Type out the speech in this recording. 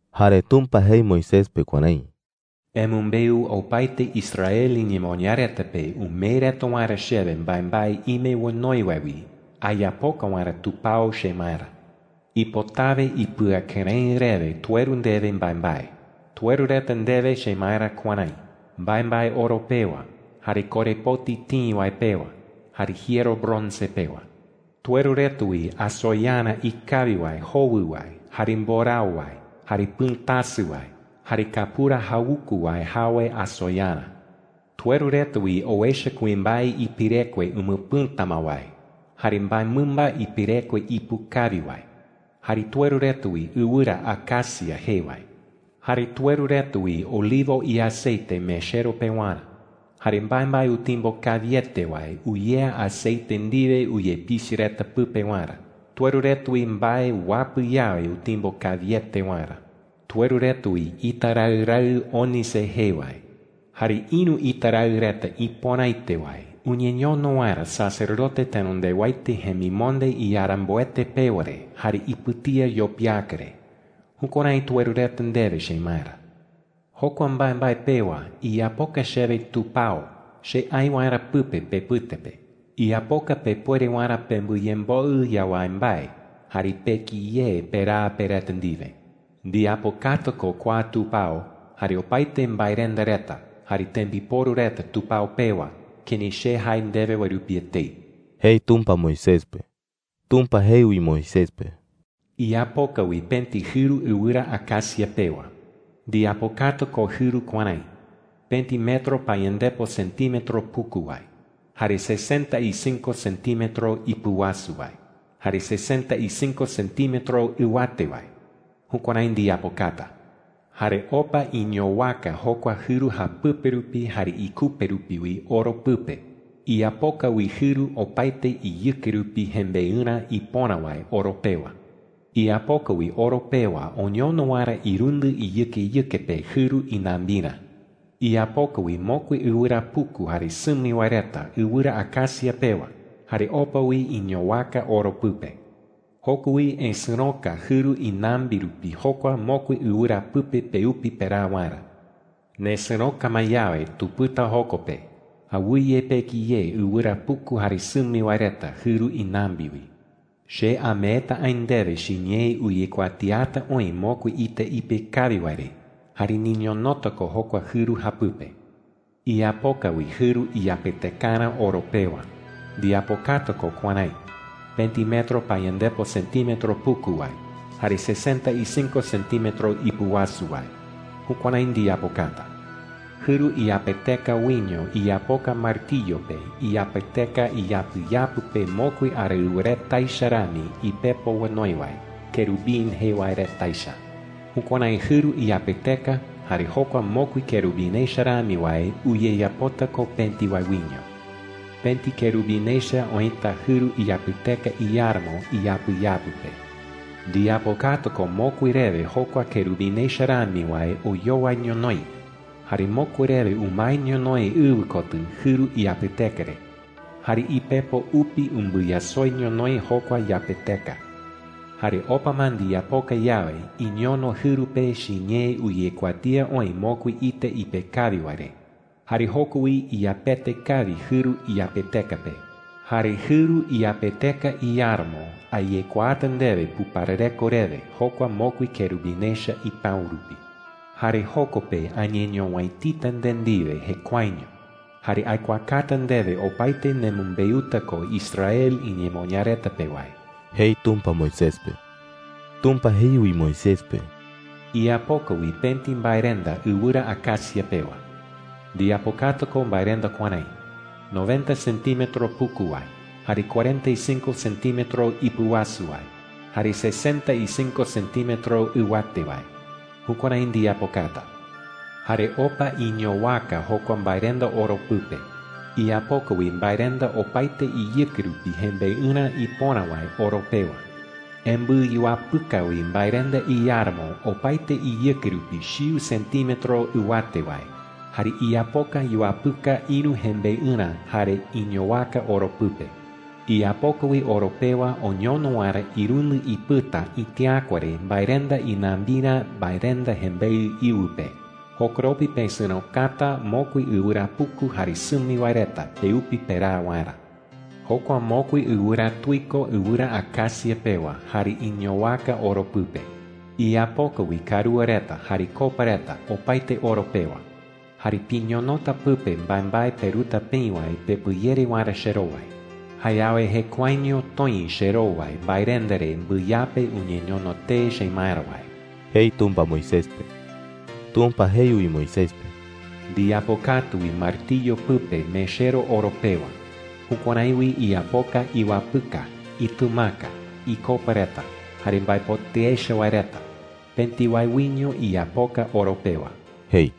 Jare Tumpa jei Moisés pe kuärái: “Emɨmbeu opaete Israel iñemoñaa reta pe umee reta waerä chewe mbaembae ime onoi wae wi ayapoka waerä tupao chemaerä,” jei. “Ipotawe ipɨakɨrëɨ rewe tueru ndewe mbaembae,” jei. “Tueru reta ndewe chemaerä kuärái: mbaembae oro pewa, jare korepoti tïi wae pewa, jare jiero bronce pewa,” jei. “Tueru reta wi asoyarä ikawi wae jowɨ wae, jare mborao wae, jare pɨ̈tasɨ wae, jare kapura jawuku wae jawe asoyarä,” jei. “Tueru reta wi owecha kuimbae ipirekue umɨpɨ̈ta ma wae, jare mbaemɨmba ipirekue ipu kawi wae,” jei. “Jare tueru reta wi ɨwɨra acacia jee wae. Jare tueru reta wi olivo iaceite mechero pewarä, jare mbaembae utimbo kawiete wae uyea aceite ndiwe uyepichɨ reta pɨpe waerä. Tueru reta wi mbae uapɨ yawe utimbo kawiete waerä,” jei. “Tueru reta wi ita raɨ raɨ ónice jee wae, jare ïru ita raɨ reta ipöraete wae uñeñono waerä sacerdote tenondewaete jemimonde iyaramboete pewa re jare ipɨtía yopiaka re. Jukuärái tueru reta ndewe chemaerä,” jei. “Jokua mbaembae pewa iyapoka chewe tupao che aï waerä pɨpe pepɨte pe. Iyapoka pepuere waerä pembɨyemboɨ yawái mbae jare peki ye peraa pe reta ndiwe,” jei. “Ndiyapokata ko kua tupao, jare opaete mbaerenda reta, jare tembiporu reta tupao pewa kërái che jae ndewe wae rupi etei,” jei Tumpa Moisés pe. Tumpa jei wi Moisés pe: “Iyapoka wi pëti jɨru ɨwɨra acacia pewa. Ndiyapokata ko jɨru kuärái: pëti metro payandepo centímetro puku wae, jare sesenta y cinco centímetro ipɨwasu wae, jare sesenta y cinco centímetro ɨwate wae. Jukuärái ndiyapokata,” jei. “Jare opa iñowaka jokua jɨru japɨpe rupi jare ikupe rupi wi oro pɨpe. Iyapoka wi jɨru opaete iyɨke rupi jembeɨrä ipöra wae oro pewa. Iyapoka wi oro pewa oñono waerä irundɨ iyɨkeyɨke pe jɨru inambirä,” jei. “Iyapoka wi mokui ɨwɨra puku jare sɨmi wae reta ɨwɨra acacia pewa jare opa wi iñowaka oro pɨpe. Joko wi esɨ̈roka jɨru inambi rupi jokua mokui ɨwɨra pɨpe peupi peraa waerä,” jei. “Nesɨ̈roka ma yawe, tupɨta joko pe. Awɨye peki ye ɨwɨra puku jare sɨmi wae reta jɨru inambi wi,” jei. “Che ameeta aï ndewe chiñee uyekuatiata oï mokui ita ipe kawi wae re. Jare niñonota ko jokua jɨru japɨpe,” jei. “Iyapoka wi jɨru iyapetekarä oro pewa. Ndiyapokata ko kuärái: pëti metro payandepo centímetro puku wae, jare sesenta y cinco centímetro ipɨwasu wae. Jukuärái ndiyapokata,” jei. “Jɨru iyapeteka wiño iyapoka martiyo pe iyapeteka iyapɨyapɨ pe mokui araɨwa reta echa rami ipepo onoi wae, kerubín jee wae reta echa. Jukuärái jɨru iyapeteka jare jokua mokui kerubín echa rami wae uyeyapota ko pëti wae wiño. Pëti kerubín echa oïta jɨru iyapeteka iáramo iyapɨyapɨ pe. Ndiyapokata ko mokui rewe jokua kerubín echa rami wae oyowai ñonoï, jare mokui rewe umae ñonoï ɨwɨ kotɨ jɨru iyapeteka re. Jare ipepo upi umbɨyasoi ñonoï jokua yapeteka,” jei. “Jare opa ma ndiyapoka yawe, iñono jɨru pe chiñee uyekuatía oï mokui ita ipe kawi wae re. Jare joko wi iyapete kawi jɨru iyapeteka pe,” jei. “Jare jɨru iyapeteka iáramo ayekuaata ndewe puparareko rewe jokua mokui kerubín echa ipäu rupi,” jei. “Jare joko pe añeñowäitita nde ndiwe jekuaeño, jare aikuaakata ndewe opaete nemɨmbeuta ko Israel iñemoñaa reta pe wae,” jei Tumpa Moisés pe. Tumpa jei wi Moisés pe: “Iyapoka wi pëti mbaerenda ɨwɨra acacia pewa,” jei. “Ndiyapokata ko mbaerenda kuärái: noventa centímetro puku wae, jare cuarenta y cinco centímetro ipɨwasu wae, jare sesenta y cinco centímetro ɨwate wae. Jukuärái ndiyapokata,” jei. “Jare opa iñowaka jokua mbaerenda oro pɨpe. Iyapoka wi mbaerenda opaete iyɨke rupi jembeɨrä ipöra wae oro pewa,” jei. “Embɨyuapɨka wi mbaerenda iáramo opaete iyɨke rupi chiu centímetro ɨwate wae, jare iyapoka yuapɨka ïru jembeɨrä, jare iñowaka oro pɨpe,” jei. “Iyapoka wi oro pewa oñono waerä irundɨ ipɨta itiäkua re mbaerenda inambirä mbaerenda jembeɨ íɨwɨ pe. Jokoropi pesɨ̈rokata mokui ɨwɨra puku jare sɨmi wae reta peupi peraa waerä,” jei. “Jokua mokui ɨwɨra tuiko ɨwɨra acacia pewa, jare iñowaka oro pɨpe,” jei. “Iyapoka wi karúa reta jare copa reta, opaete oro pewa. Jare piñonota pɨpe mbaembae peruta peï wae pepɨyere waerä cherowai. Jayawe jekuaeño toï cherowai mbaerenda re mbɨyape uñeñono tee chemaerä wae,” jei Tumpa Moisés pe. Tumpa jei wi Moisés pe: “Ndiyapokata wi martiyo pɨpe mechero oro pewa. Jukuärái wi iyapoka iwapɨka, itɨmaka, icopa reta, jare mbaepotɨ echa wae reta. Pëti wae wiño iyapoka oro pewa,” jei. (